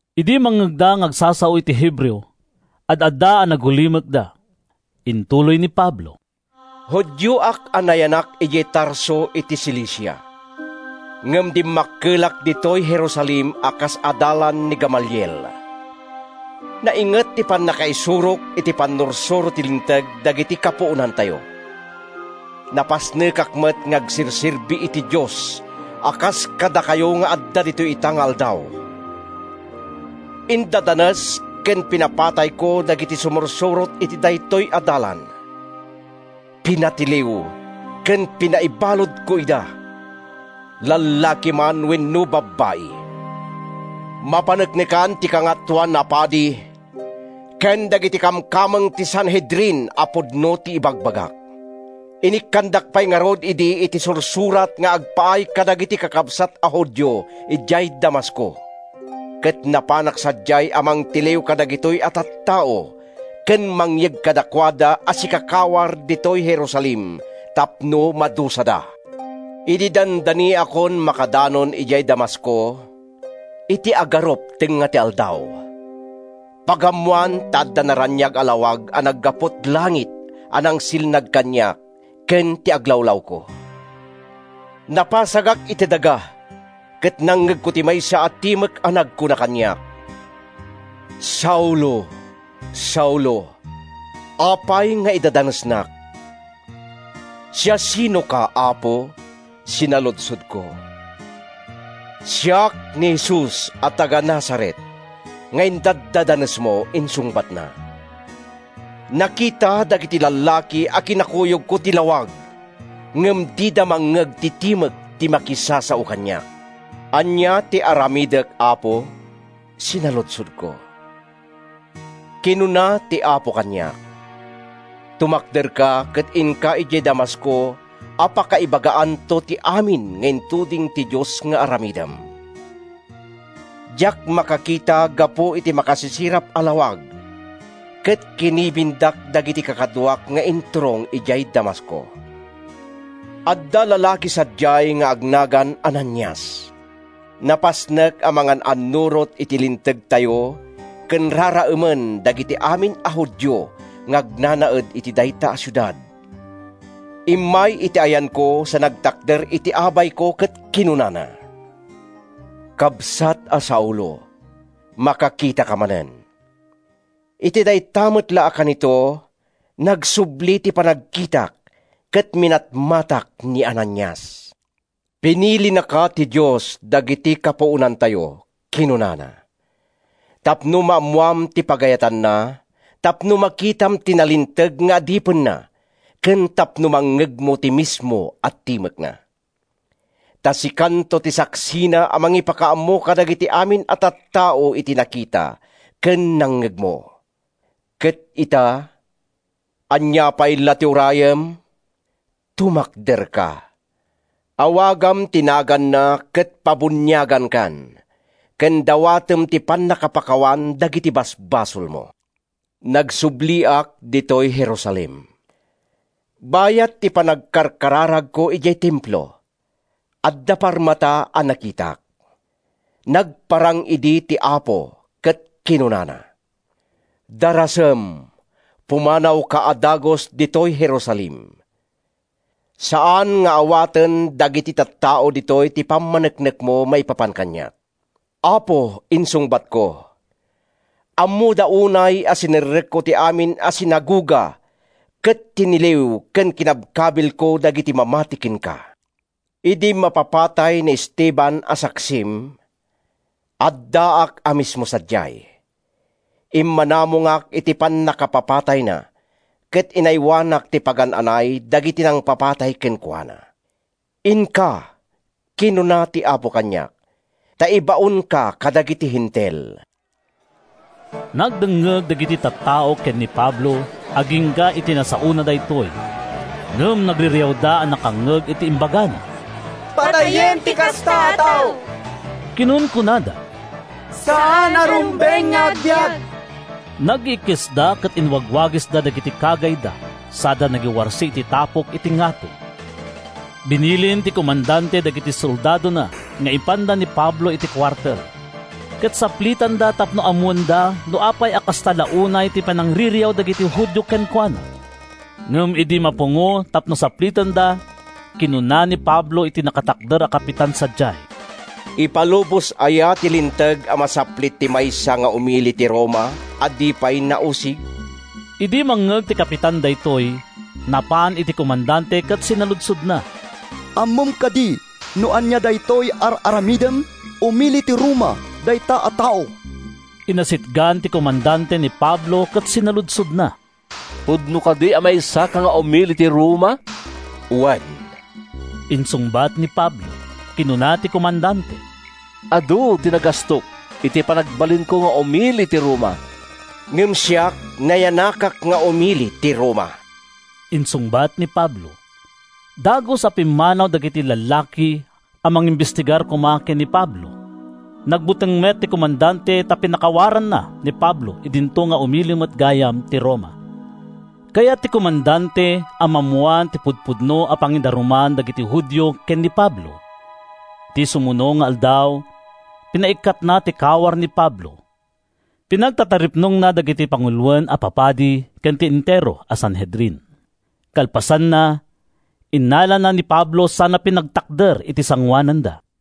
Idi mangngegda nga agsasao iti Hebreo, ad-adda a nagulimekda. Intuloy ni Pablo: “Judioak a nayanak idiay Tarso iti Cilicia, ngem dimmakkelak ditoy Jerusalem a kas adalan ni Gamaliel. Nainget ti pannakaisurok iti pannursuro ti Linteg dagiti kapuonantayo. Napasnekak met nga agserserbi iti Dios a kas kadakayo nga adda ditoy ita nga aldaw. Indadanes ken pinapatayko dagiti sumursurot iti daytoy a Dalan. Pinatiliw ken pinaibaludko ida—lallaki man wenno babbai. Mapaneknekan ti Kangatoan a Padi ken dagiti kamkameng ti Sanhedrin a pudno ti ibagbagak. Inikkandak pay ngarud idi iti sursurat nga agpaay kadagiti kakabsat a Judio idiay Damasco, ket napanak sadiay a mangtiliw kadagitoy a tattao ken mangyeg kadakuada a sikakawar ditoy Jerusalem tapno madusada.” “Idi dandaniakon makadanon idiay Damasco, iti agarup tengnga ti aldaw, pagammoan ta adda naraniag a lawag a naggapu’t langit a nangsilnag kaniak ken ti aglawlawko. Napasagak iti daga ket nangngegko ti maysa a timek a nagkuna kaniak, ‘Saulo, Saulo! Apay nga idadanesnak?’ “‘Siasinoka, Apo?’ sinaludsodko. “‘Siak ni Jesus a taga-Nazaret nga idaddadanesmo!’ insungbatna. “Nakita dagiti lallaki a kinakuyogko ti lawag ngem dida mangngeg ti timek ti makisasao kaniak. ‘Ania ti aramidek, Apo?’ sinaludsodko. “Kinuna ti Apo kaniak, ‘Tumakderka, ket inka idiay Damasco a pakaibagaanto ti amin nga intuding ti Dios nga aramidem.’ “Diak makakita gapu iti makasisirap a lawag, ket kinibindak dagiti kakaduak nga inturong idiay Damasco. “Adda lalaki sadiay nga agnagan Ananias. Napasnek a mangan-annurot iti Lintegtayo ken raraemen dagiti amin a Judio nga agnanaed iti dayta a siudad. Immay iti ayanko sa nagtakder iti abayko ket kinunana, ‘Kabsat a Saulo, makakitaka manen!’ “Iti dayta met la a kanito, nagsubli ti panagkitak ket minatmatak ni Ananias. “‘Pinilinaka ti Dios dagiti kapuonantayo,’ kinunana, ‘tapno maammoam ti pagayatanna, tapno makitam ti nalinteg nga Adipenna ken tapno mangngegmo ti mismo a timekna. Ta sikanto ti saksina a mangipakaammo kadagiti amin a tattao iti nakita ken nangngegmo. Ket ita, ania pay la ti urayem? Tumakderka. Awagam ti naganna ket pabuniaganka ken dawatem ti pannakapakawan dagiti basbasolmo.’” “Nagsubliak ditoy Jerusalem. Bayat ti panagkarkararagko idiay Templo, adda parmata a nakitak. Nagparang idi ti Apo ket kinunana, ‘Darasem! Pumanawka a dagus ditoy Jerusalem; saan nga awaten dagiti tattao ditoy ti pammaneknekmo maipapan kaniak.’ “‘Apo,’ insungbatko, ‘ammoda unay a sinerrekko ti amin a sinagoga ket tiniliw ken kinabkabilko dagiti mamati kenka. Idi mapapatay ni Esteban a saksim, addaak a mismo sadiay. Immanamongak iti pannakapapatayna ket inaywanak ti pagan-anay dagiti nangpapatay kenkuana.’ “‘Inka,’ kinuna ti Apo kaniak, ‘ta ibaonka kadagiti Hentil.’” Nagdengngeg dagiti tattao ken ni Pablo agingga iti nasaona daytoy. Ngem nagririawda a nakangngeg iti imbagana. “Patayen ti kasta a tao!” kinunkunada. “Saan a rumbeng nga agbiag!” Nagiikkisda ket inwagwagisda dagiti kagayda sada nagiwarsi iti tapok iti ngato. Binilin ti komandante dagiti soldadona nga ipanda ni Pablo iti kuartel, ket saplitenda tapno ammoenda no apay a kasta la unay ti panangririaw dagiti Judio kenkuana. Ngem idi mapungo tapno saplitenda, kinuna ni Pablo iti nakatakder a kapitan sadiay, “Ipalubos aya ti linteg a masaplit ti maysa nga umili ti Roma a di pay nausig?” Idi mangngeg ti kapitan daytoy, napan iti komandante ket sinaludsodna, “Ammom kadi no ania daytoy ar-aramidem? Umili ti Roma dayta a tao!” Inasitgan ti komandante ni Pablo ket sinaludsodna, “Pudno kadi a maysaka nga umili ti Roma?” “Wen,” insungbat ni Pablo. Kinuna ti komandante, “Adu ti nagastok iti panagbalinko nga umili ti Roma.” “Ngem siak, nayanakak nga umili ti Roma,” insungbat ni Pablo. Dagus a pimmanaw dagiti lallaki a mangimbestigar koma ken ni Pablo. Nagbuteng met ti komandante ta pinakawaranna ni Pablo idinto nga umili met gayam ti Roma. Kayat ti komandante a maammoan ti pudpudno a pangidaruman dagiti Judio ken ni Pablo. Iti sumuno nga aldaw, pinaikkatna ti kawar ni Pablo. Pinagtataripnongna dagiti panguloen a papadi ken ti entero a Sanhedrin. Kalpasanna, innalana ni Pablo sana pinagtakder iti sangoananda.